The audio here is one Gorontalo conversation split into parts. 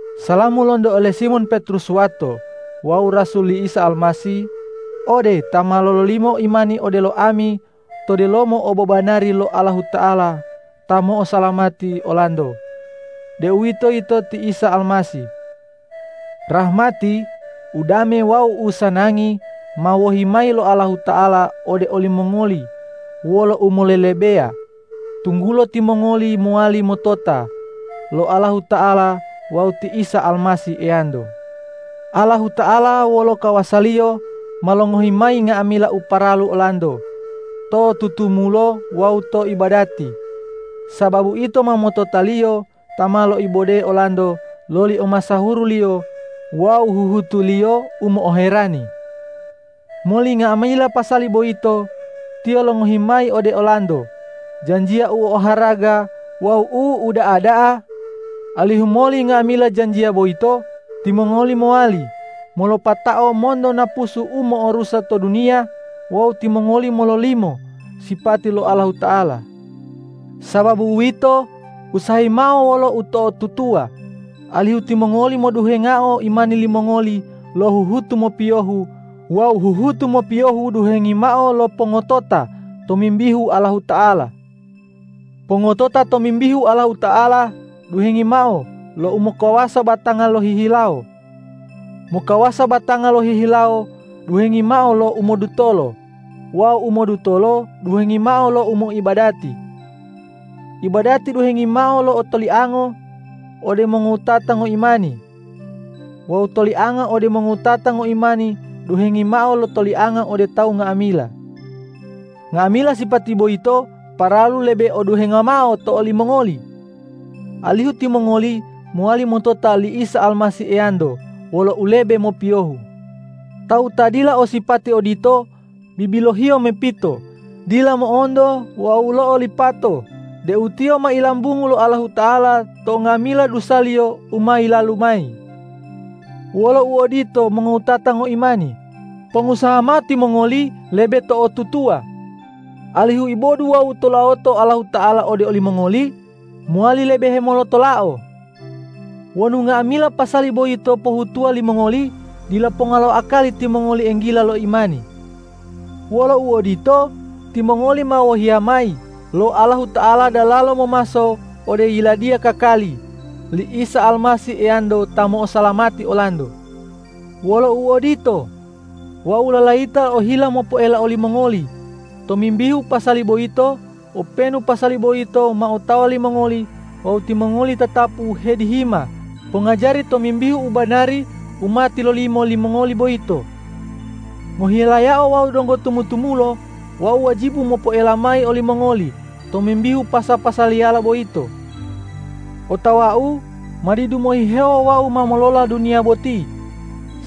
Salamu lonto ole Simon Petrus wato wawu rasul li Isa Almasih ode ta ma lololimo imani odelo ami to delomo obobanari lo Allahuta'ala ta mo'osalamati olanto, deuwitoyito ti Isa Almasih. Rahmati, udame wawu usanangi ma wohi mayi lo Allahuta'ala ode olimongoli wolo umolelebeya, tunggulo timongoli mowali motota lo Allahuta'ala wawu ti Isa Almasih Eyanto. Allahuta'ala wolo kawasa-Liyo ma longohi mayi nga'amila u paralu olanto to tutumulo wawu to ibadati, sababu ito ma motota-Liyo ta ma loibode olanto loli omasahuru-Liyo wawu huhutu-Liyo u mo'oherani. Moli nga'amila pasali boyito Tiyo longohi mayi ode olanto janjiya u oharaga wawu u uda'a da'a, alihu moli nga'amila janjiya boyito timongoli mowali molopatao monto napusu u mo'orusa to duniya wawu timongoli mololimo sipati lo Allahuta'ala. Sababu uwito, usahayi mao wolo uto'otutuwa, alihu timongoli moduhengao imani limongoli lo huhutu mopiyohu wawu huhutu mopiyohu duhengi mao lo pongotota tomimbihu Allahuta'ala. Pongotota tomimbihu Allahuta'ala duhengi mao lo umokawasa batanga lohihilawo. Mokawasa batanga lohihilawo duhengi mao lo umodutolo wawu umodutolo duhengi mao lo umoibadati. Ibadati duhengi mao lo tolianga ode mongowutata ngoimani wawu tolianga ode mongowutata ngoimani duhengi mao lo tolianga ode tawu nga'amila. Nga'amila sipati boyito paralu lebe o duhenga mao to olimongoli, alihu timongoli mowali motota li Isa Almasih Eyanto wolo ulebe mopiyohu. Tawu ta dila o sipati odito bibilohiyo mepito, dila mo'onto wawu lo'olipato deu tiyo ma ilambungu lo Allahuta'ala to nga'amila dusaliyo u ma yilalu mayi. Wolo uodito mongowutata ngoimani, pongusaha mao timongoli lebe to'otutuwa, alihu ibodu wawu tulawoto Allahuta'ala ode olimongoli mowali lebe hemolotolao. Wonu nga'amila pasali boyito pohutuwo limongoli, dila ponga lo akali timongoli enggila lo imani. Wolo uodito, timongoli ma wohiya mayi lo Allahuta'ala dalalo momaso ode Yiladiya kakali li Isa Almasih Eyanto ta mo'osalamati olanto. Wolo uodito, wau lalayita ohila mopoela olimongoli tomimbihu pasali boyito, openu pasali boyito ma otawa limongoli wawu timongoli tatapu hedihima pongajari tomimbihu u banari u ma tilolimo limongoli boyito. Ngohilayao wau donggo tumu-tumulo, wau wajibu mopoela mayi olimongoli tomimbihu pasa-pasaliyala boyito. Otawau ma didu mohihewo wau ma molola duniya boti,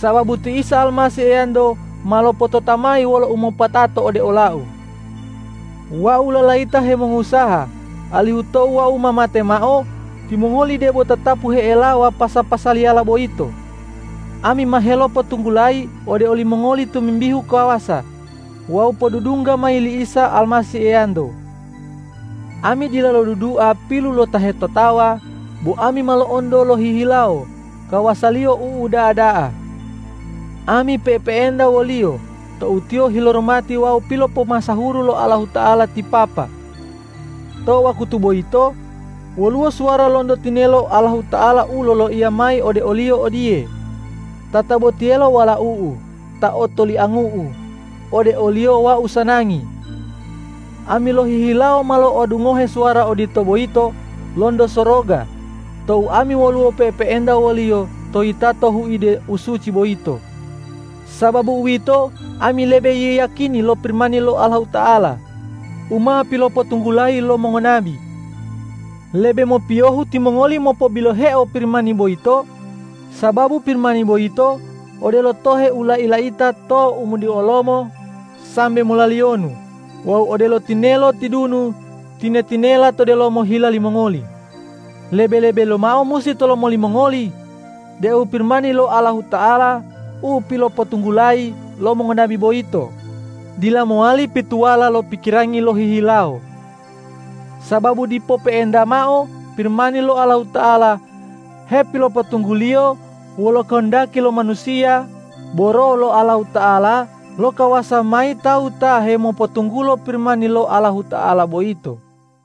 sababu ti Isa Almasih Eyanto ma lopotota mayi wolo umopatato ode olau. Wau lalayita hemongusaha alihu tou wau ma mate mao, timongoli debo tatapu he'elawa pasa-pasaliyala boyito. Ami ma helopotunggulayi ode olimongoli tomimbihu kawasa wawu podudungga mayi li Isa Almasih Eyanto. Ami dila lodudua pilu lo ta hetotawa, bo ami ma lo'onto lohihilawo kawasa-Liyo u uda'a da'a. Ami pe'epe'enta wo-Liyo tou Tiyo hiloromati wawu pilopomasahuru lo Allahuta'ala ti Papa. To wakutu boyito woluwo suwara lonto tinelo Allahuta'ala u loloiya mayi ode o-Liyo odiye,”Tatabotiyelo Walau-U ta otoliangu-U, ode o-Liyo Wau sanangi!” Ami lohihilawo ma lo'odungohe suwara odito boyito lonto soroga tou ami woluwo pe'epe'enta wo-Liyo to yitato huide u suci boyito. Sababu uwito, ami lebe yiyakini lo Pirimani lo Allahuta'ala u ma pilopotunggulayi lo mongonabi. Lebe mopiyohu timongoli mopo'obiloheo Pirimani boyito, sababu Pirimani boyito odelo tohe u lai-laita to umodiolomo sambe molaliyonu wawu odelo tinelo tidunu tine-tinela to delomo hila limongoli. Lebe-lebe lomao musi tolomo limongoli deu Pirimani lo Allahuta'ala u pilopotunggulayi lo mongonabi boyito, dila mowali pituwala lo pikirangi lohihilawo. Sababu dipo pe'enta mao Pirimani lo Allahuta'ala hepilopotungguliyo wolo kohondaki lo manusiya, bo Roh lo Allahuta'ala lokawasa mayi tawu ta hemopotunggulo Pirimani lo Allahuta'ala boyito.